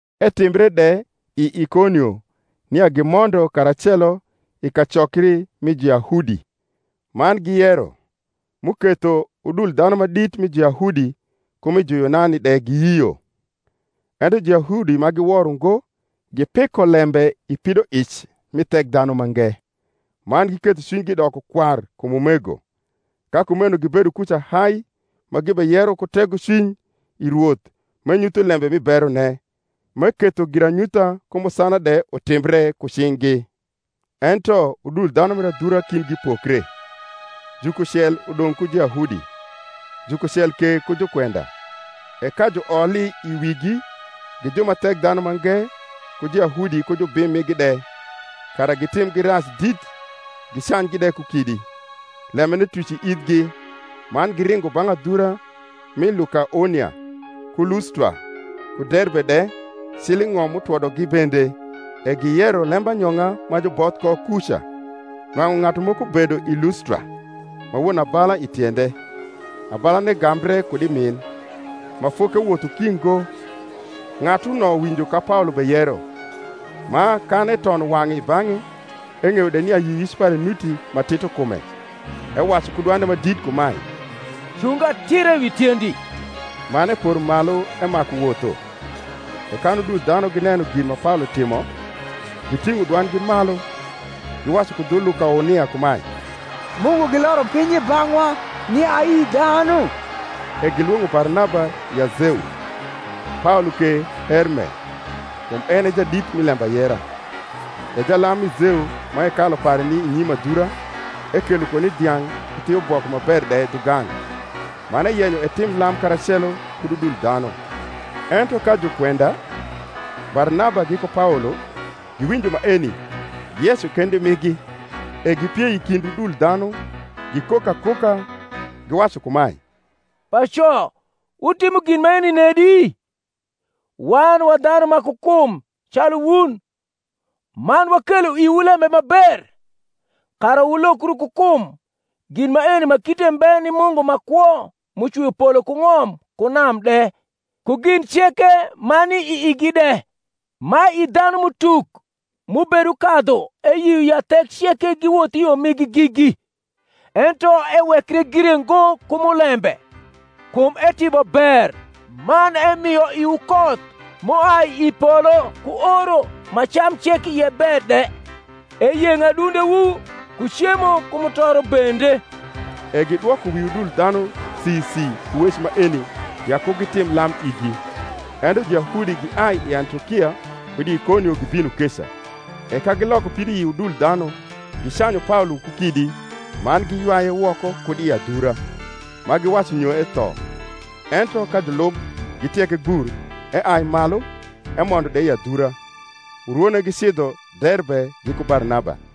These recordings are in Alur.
Etimbre de i Ikonio nia gimondo karacelo i kacokri mi Juyahudi, man giyero, m’uketho udul dhanu ma dit mi Juyahudi ku mi Juyunani de giyio. Ento Juyahudi ma giwor ungo gipiko lembe i pidoic mi Thekdhanumange, man giketho cwinygi doko kwar kum umego. Ka kumeno gibedo kuca hai ma gibeyero ku tegocwiny i Rwoth m’enyutho lembe mi berone, m’eketho giranyutha ku musana de utimbre ku cing’gi. Ento udul dhanu mir adhura kindgi pokre; jukucel udong’ ku Juyahudi, jukucel ke ku jukwenda. E ka juoli i wigi gi ju ma Thekdhanumange ku Juyahudi ku jubim migi de, kara gitimgi rac dit gicanygi de ku kidi, lembene tuc i ithgi, man giringo bang’ adhura mi Lukaonia, ku Lustra, ku Derbe de, cil i ng’om m’utwodogi bende: e giyero lembanyong’a ma juboth ko kuca. Nwang’u ng’atu moko bedo i Lustra, ma won abala i tiende, abalane gambre kud i min, ma fokewotho ki ngo. Ng’atuno winjo ka Paolo beyero: ma, kan etono wang’e i bang’e, eng’eyo de nia yioyic pare nuti ma tito kume, ewacu ku dwande ma dit kumae, Cung atira wi tiendi. Man epor malu emaku wotho. E kan udul dhanu gineno gin ma Paolo timo, giting’o dwandgi malu, giwacu ku dhu Lukaonia kumae, Mungu giloro piny i bang’wa ni ayi dhanu. E gilwong’o Barnaba ya Zeu; Paolo ke Herme, kum en e jadit mi lembayera. E jalam mi Zeu ma hekalu pare ni i nyim adhura, ekelo koni dhiang’ ku thiuboko ma ber de dhugang’, man eyenyo etim lam karacelo kud udul dhanu. Ento ka jukwenda, Barnaba giku Paolo, giwinjo maeni, giyeco kendi migi, e gipiei i kind udul dhanu, gikok akoka, giwacu kumae, Paco, wutimo gin maeni nedi? Wan wa dhanu ma ku kum calu wun, man wakelo iwu lembe ma ber, kara wulokru ku kum gin maeni ma kite mbe ni Mungu ma kwo m’ucwio polo ku ng’om ku nam de, ku gin ceke ma ni i igi de: ma i dhanum’utuk m’ubedukadhu eyio ya thek ceke giwoth i yo migi gigi. Ento ewekre gire ngo ku mulembe, kum etimo ber man emio iwu koth m’uai i polo ku oro ma cam cek ie ber de, eyeng’o adundewu ku cemo ku mutoro bende. E gidwoko wi udul dhanu si si ku wec maeni ya ku gitim lam igi. Ento Juyahudi giai i Antiokia kud Ikonio gibino keca; e ka giloko pidoi udul dhanu, gicanyu Paolo ku kidi, man giywaye woko kud i adhura, ma giwacu nyo etho. Ento ka julub gitieke gbur, eai malu, emondo de i adhura: urwone gicidho Derbe giku Barnaba.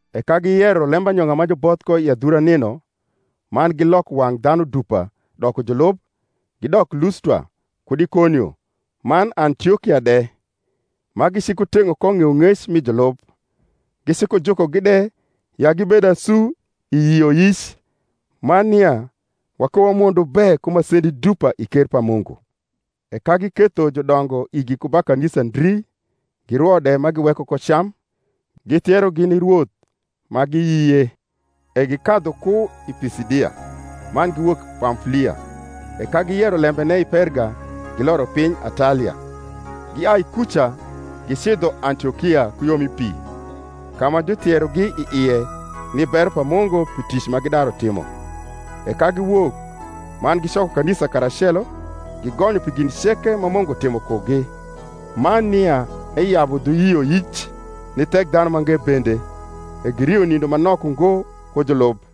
E ka giyero lembanyong’a ma juboth ko i adhura nino, man giloko wang’ dhanu dupa doko julub, gidok Lustra, kud Ikonio, man Antiokia de, ma gicikuteng’o ko ng’eyong’ec mi julub, gicikujukogi de ya gibed asu i yioyic man nia wakowamondo be ku masendi dupa i ker pa Mungu. E ka giketho judongo igi ku ba kanisa ndri, girwo de ma giweko ko cam, githierogi ni Rwoth, ma giyie. E gikadhu ku i Pisidia, man giwok Pamfulia. E ka giyero lembene i Perga, giloro piny Atalia; giai kuca gicidho Antiokia ku yo mi pi, ka ma juthierogi i ie ni bero pa Mungu pi tic ma gidaru timo. E ka giwok, man gicoko kanisa karacelo, gigonyo pi gin ceke ma Mungu timo kugi, man nia eyabu dhu yioyic ni Thekdhanumange bende. E girio nindo ma nok ungo ku julub.